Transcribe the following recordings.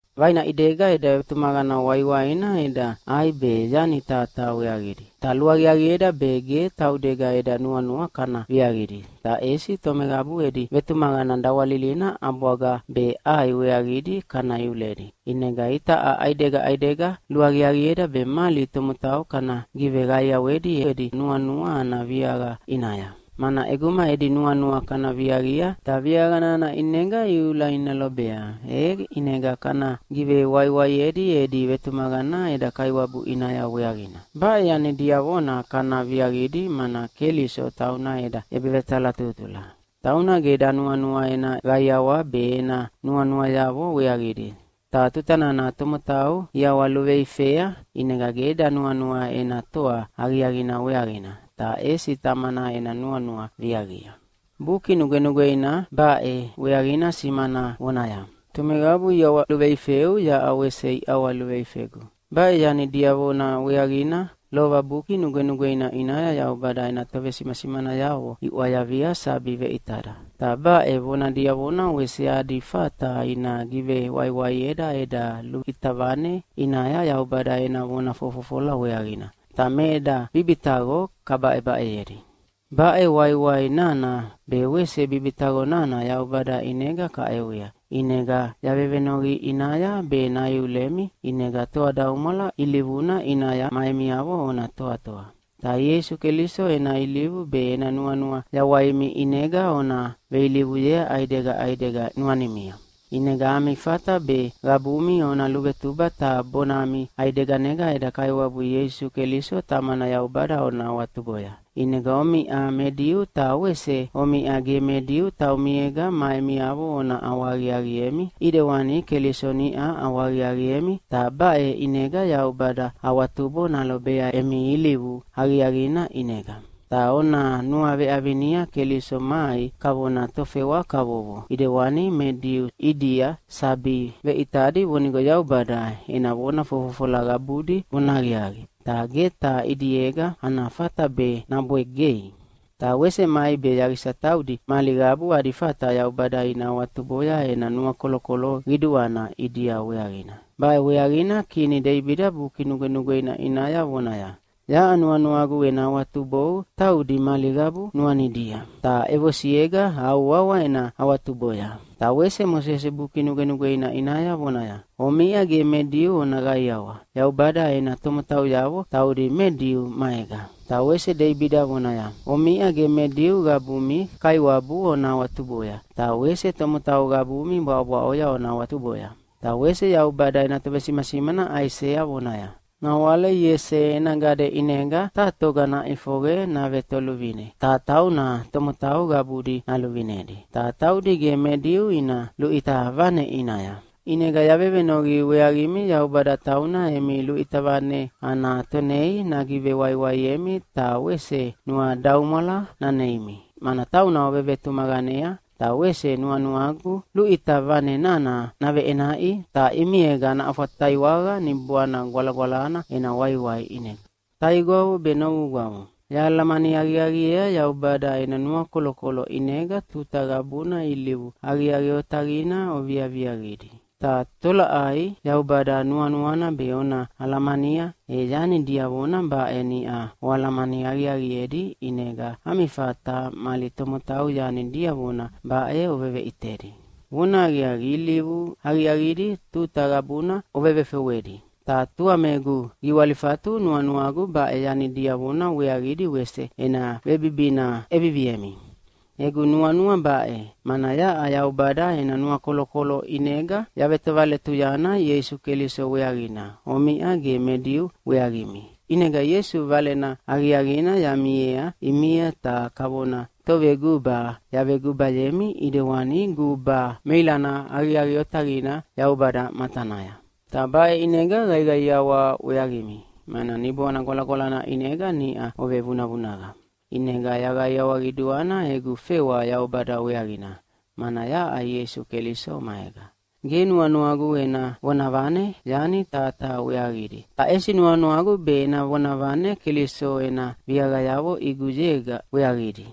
Vaina ʼidega eda vetumaqana waiwaina eda ʼai be yani taha taha weaqidi. Ta luaqiaqieda be ge taudega eda nuanua kana viaqidi, ta ʼesi tomeqabu edi vetumaqana dawalilina ʼabwaga be ʼai weaqidi kana iuledi. ʼInega itaʼa ʼaidega ʼaidega luaqiaqieda be mali tomotau kana giveqaiawedi edi nuanua ana viaqa ʼinaya. Mana ʼeguma edi nuanua kana viaqia, ta viaqa nana ʼinega iula ina lobea, e ʼinega kana givewaiwaiedi edi vetumaqana eda Kaiwabu ʼinaya weaqina. Baʼe yani diavona kana viaqidi, mana Keliso tauna eda ʼebevetalatutula. Tauna ge danuanua ena qaiawa be ena nuanuayavo weaqidi, ta tuta nana tomotau iʼawaluveifea ʼinega ge danuanua ena toa aqiaqina weaqina, ta ʼesi Tamana ena nuanua viaqia. Buki Nugwenugweina baʼe weaqina simana vonaya, “Tomeqabu iʼawaluveifeu, yaʼa wese iʼawaluveifegu.” Baʼe yani diavona weaqina lova Buki Nugwenugweina ʼinaya Yaubada ena tovesimasimanayavo iʼwayavia sabi veʼitada. Ta baʼe vona diavona wese adi fata ina givewaiwaieda eda luʼita vane ʼinaya Yaubada ena vona fofofola weaqina, ta me eda bibitaqo kabaʼebaʼeyedi. Baʼe waiwai nana be wese bibitaqo nana Yaubada ʼinega kaʼewea, ʼinega yavevenoqi ʼinaya be naiulemi ʼinega toadaumwala ilivuna ʼinaya ma emiavo ona toatoa. Ta Ieisu Keliso ena ilivu be ena nuanua yawaimi ʼinega ona veilivuyea ʼaidega ʼaidega nuanimia. ʼInega ami fata be qabumi ona luvetuba ta bonami ʼaideganega eda Kaiwabu Ieisu Keliso Tamana Yaubada ona awatuboya. ʼInegana omiʼa me Diu ta wese omiʼa ge me Diu taumiega ma emiavo ona ʼawahaqiaqiemi, ʼidewani Keliso niʼa ʼawahaqiaqiemi, ta baʼe ʼinega Yaubada awatubo nalobea emi ilivu aqiaqina ʼinega. Ta ona nuaveʼavinia Keliso mai kavona tofewa kavovo ʼidewani me Diu ʼidia sabi veʼitadi vonigo Yaubada ena vona fofofola qabudi vonahaqiaqi, ta ge taha ʼidiega ana fata be nabwegei. Ta wese mai be yaqisa taudi mali qabu adi fata Yaubada ina awatuboya ena nuakolokolo qiduana ʼidia weaqina. Baʼe weaqina kini Deibida Buki Nugwenugweina ʼinaya vonaya, “Yaʼa nuanuagu ena awatubou taudi mali qabu nuanidia. Ta ʼevosiega au wawa ena awatuboya.” Ta wese Mosese Buki Nugwenugweina ʼinaya vonaya, “Omiʼa ge me Diu ona qaiawa Yaubada ena tomotauyavo taudi me Diu maega.” Ta wese Deibida vonaya, “Omiʼa ge me Diu qabumi Kaiwabu ona awatuboya, ta wese tomotau qabumi bwaʼobwaʼoya ona awatuboya.” Ta wese Yaubada ena tovesimasimana Aisea vonaya, “Nawale Iese ena gade ʼinega taha toga naʼifoqe navetoluvine, ta tauna tomotau qabudi naluvinedi, ta taudi ge me Diu ina luʼita vane ʼinaya.” ʼInega yavevenoqi weaqimi Yaubada tauna emi luʼita vane ana Tonei nagiveqaiawemi ta wese nuadaumwala naneimi, mana tauna ovevetumaqanea. Ta wese nuanuagu luʼita vane nana naveʼenaʼi, ta ʼimiega naʼafwataiwaqa Niboana Gwalagwalana ena waiwai ʼinega. Taigwavo be novugwavo, yahalamani aqiaqiea Yaubada ena nuakolokolo ʼinega tuta qabuna ilivu aqiaqi otaqidi oviaviaqidi. Ta tolaʼai Yaubada nuanuana be ona alamania, e yani diavona baʼe niʼa oalamani aqiaqiedi ʼinega ami fata mali tomotau yani diavona baʼe oveveʼitedi. Vonahaqiaqi, ilivu aqiaqidi tuta qabuna ovevefewedi, ta tua me egu giwalifatu nuanuagu baʼe yani diavona weaqidi wese ena vebibina ʼeviviemi. Egu nuanua baʼe, mana yaʼa Yaubada ena nuakolokolo ʼinega yavetovaletuyana Ieisu Keliso weaqina omiʼa ge me Diu weaqimi. ʼInega Ieisu Valena Aqiaqina yamiea ʼimia ta kavona toveguba yavegubayemi ʼidewani guba meilana aqiaqi otaqina Yaubada matanaya. Ta baʼe ʼinega qaiqaiawa weaqimi, mana Niboana Gwalagwalana ʼinega niʼa ovevunavunaqa. ʼInega yaqaiawa qiduana egu fewa Yaubada weaqina, mana yaʼa Ieisu Keliso maega. Ge nuanuagu ena vonavane yani taha taha weaqidi, ta ʼesi nuanuagu be ena vonavane Keliso ena viaqayavo ʼiguyega weaqidi.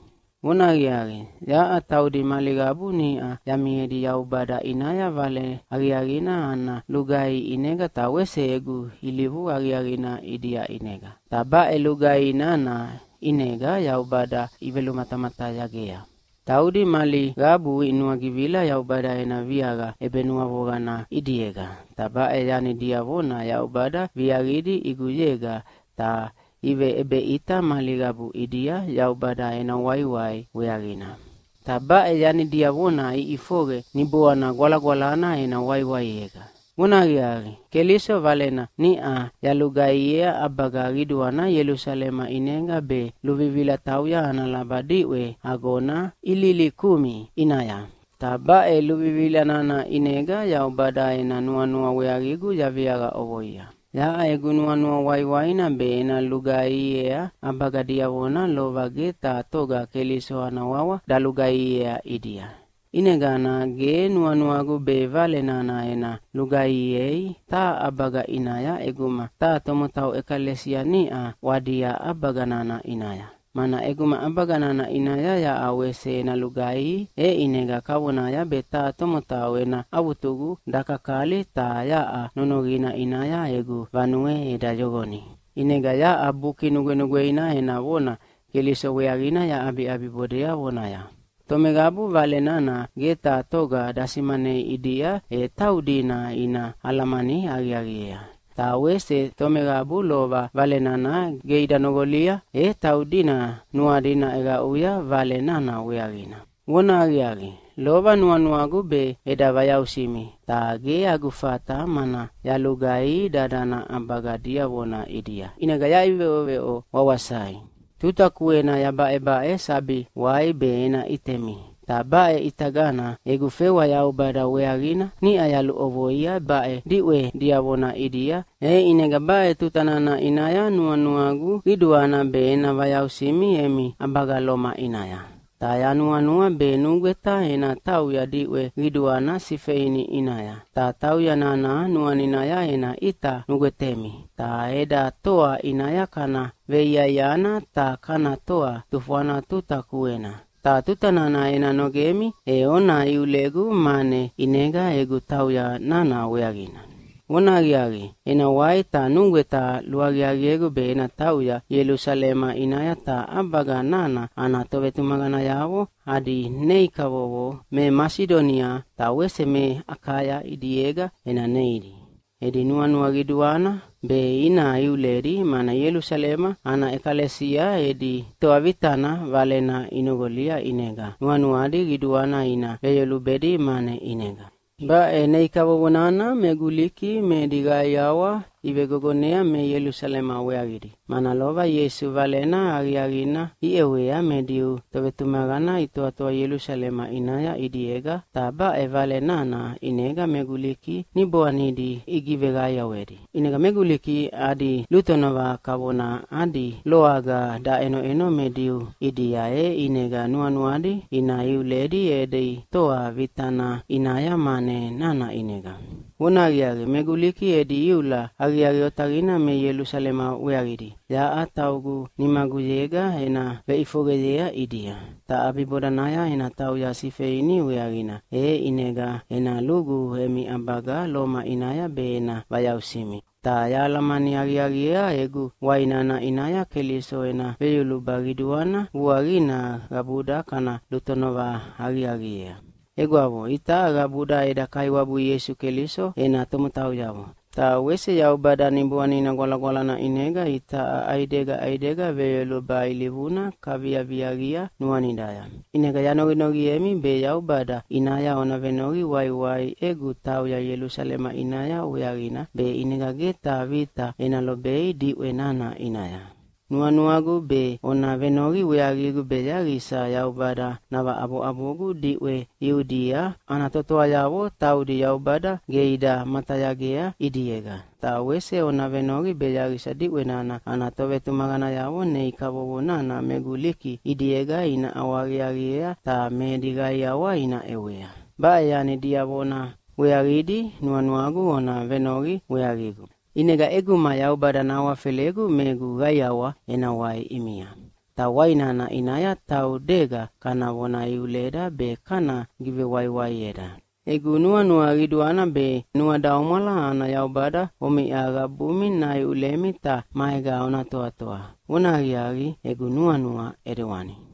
Vonahaqiaqi, yaʼa taudi mali qabu niʼa yamiedi Yaubada ʼinaya Vale Aqiaqina ana lugaihi ʼinega ta wese egu ilivu aqiaqina ʼidia ʼinega. Ta baʼe lugaihi nana ʼinega Yaubada ivelumatamatayagea. Taudi mali qabu inuagivila Yaubada ena viaqa ʼebenuavoqana ʼidiega, ta baʼe yani diavona Yaubada viaqidi ʼiguyega, ta iveʼebeʼita mali qabu ʼidia Yaubada ena waiwai weaqina. Ta baʼe yani diavona iʼifoqe Niboanina Gwalagwalana ena waiwaiega. Vonahaqiaqi, Keliso Valena niʼa yalugaihiea ʼabaga qiduana Ielusalema ʼinega be luvivila tauya ana laba diʼwe agona Ililikumi ʼinaya, ta baʼe luvivila nana ʼinega Yaubada ena nuanua weaqigu yaviaqa ʼovoia. Yaʼa egu nuanua waiwaina be ena lugaihiea ʼabaga diavona lova ge taha toga Keliso ana wawa dalugaihiea ʼidia. ʼInegana ge nuanuagu be Vale nana ena lugaihiei taha ʼabaga ʼinaya ʼeguma taha tomotau ʼekalesia niʼa ʼwadia ʼabaga nana ʼinaya. Mana ʼeguma ʼabaga nana ʼinaya yaʼa wese ena lugaihi, e ʼinega kavonaya be taha tomotau ena avutugu dakakali ta yaʼa nonoqina ʼinaya egu vanue eda yoqoni. ʼInega yaʼa Buki Nugwenugweina ena vona Keliso weaqina yaʼabiʼabibodea vonaya, “Tomeqabu Vale nana ge taha toga dasimanei ʼidia, e taudina ina alamani aqiaqiea. Ta wese tomeqabu lova Vale nana ge ida noqolia, e taudina nuadi naʼeqaʼuya Vale nana weaqina.” Vonahaqiaqi, lova nuanuagu be eda vayausimi, ta ge agu fata mana yalugaihi dadana ʼabaga diavona ʼidia, ʼinega yaʼiveʼoveʼo wawasai. Tuta kuena yabaʼebaʼe sabi wai be ena ʼitemi. Ta baʼe ʼitagana egu fewa Yaubada weaqina niʼa yaluʼovoia baʼe diʼwe diavona ʼidia, e ʼinega baʼe tuta nana ʼinaya nuanuagu qiduana be ena vayausimi emi ʼabaga Loma ʼinaya. Ta yanuanua be nugweta ena tauya diʼwe qiduana Sifeini ʼinaya. Ta tauya nana nuaninaya ena ʼita nugwetemi. Ta eda toa ʼinaya kana veiaiana ta kana toa tufwana tuta kuena, ta tuta nana ena nogemi e ona iulegu mane ʼinega egu tauya nana weaqina. Vonahaqiaqi, ena wai ta nugweta luaqiaqiegu be ena tauya Ielusalema ʼinaya ta ʼabaga nana ana tovetumaqanayavo adi nei kavovo me Masidonia ta wese me Akaya ʼidiega ena neidi. Edi nuanua qiduana be ina iuledi, mana Ielusalema ana ʼekalesia edi toa vitana valena inoqolia, ʼinega nuanuadi qiduana ina veyolubedi mane ʼinega. Baʼe nei kavovo nana me Guliki me edi qaiawa ivegogonea me Ielusalema weaqidi, mana lova Ieisu Valena Aqiaqina iʼewea me Diu tovetumaqana itoatoa Ielusalema ʼinaya ʼidiega, ta baʼe Vale nana ʼinega me Guliki niboanidi igiveqaiawedi. ʼInega me Guliki adi lutonova kavona adi loaga daʼenoʼeno me Diu ʼidia, e ʼinega nuanuadi ina iuledi edi toa vitana ʼinaya mane nana ʼinega. Vonahaqiaqi, me Guliki edi iula aqiaqi otaqina me Ielusalema weaqidi yaʼa taugu nimaguyega ena veʼifoqeyea ʼidia. Ta ʼabibodanaya ena tauya Sifeini weaqina e ʼinega ena lugu emi ʼabaga Loma ʼinaya be ena vayausimi. Ta yahalamani aqiaqiea egu wai nana ʼinaya Keliso ena veyoluba qiduana vuaqina qabuda kana lutonova aqiaqiea. Egwavo, itaʼa qabuda eda Kaiwabu Ieisu Keliso ena tomotauyavo. Ta wese Yaubada Niboanina Gwalagwalana ʼinega itaʼa ʼaidega ʼaidega veyoluba ilivuna kaviaviaqia nuanidaya. ʼInega yanoqinoqiemi be Yaubada ʼinaya ona venoqi waiwai egu tauya Ielusalema ʼinaya weaqina, be ʼinega ge taha vita ena lobei diʼwe nana ʼinaya. Nuanuagu be ona venoqi weaqigu be yaqisa Yaubada navaʼaboʼabogu diʼwe Iudia ana totoayavo taudi Yaubada ge ida matayagea ʼidiega. Ta wese ona venoqi be yaqisa diʼwe nana ana tovetumaqanayavo nei kavovo nana me Guliki ʼidiega ina ʼawahaqiaqiea ta me edi qaiawa ina ʼewea. Baʼe yani diavona weaqidi nuanuagu ona venoqi weaqigu. ʼInega ʼeguma Yaubada nahawafelegu me egu qaiawa ena wai ʼimia. Ta wai nana ʼinaya taudega kana vona iuleda be kana givewaiwaieda. Egu nuanua qiduana be nuadaumwala ana Yaubada omiʼa qabumi naiulemi ta maega ona toatoa. Vonahaqiaqi, egu nuanua ʼidewani.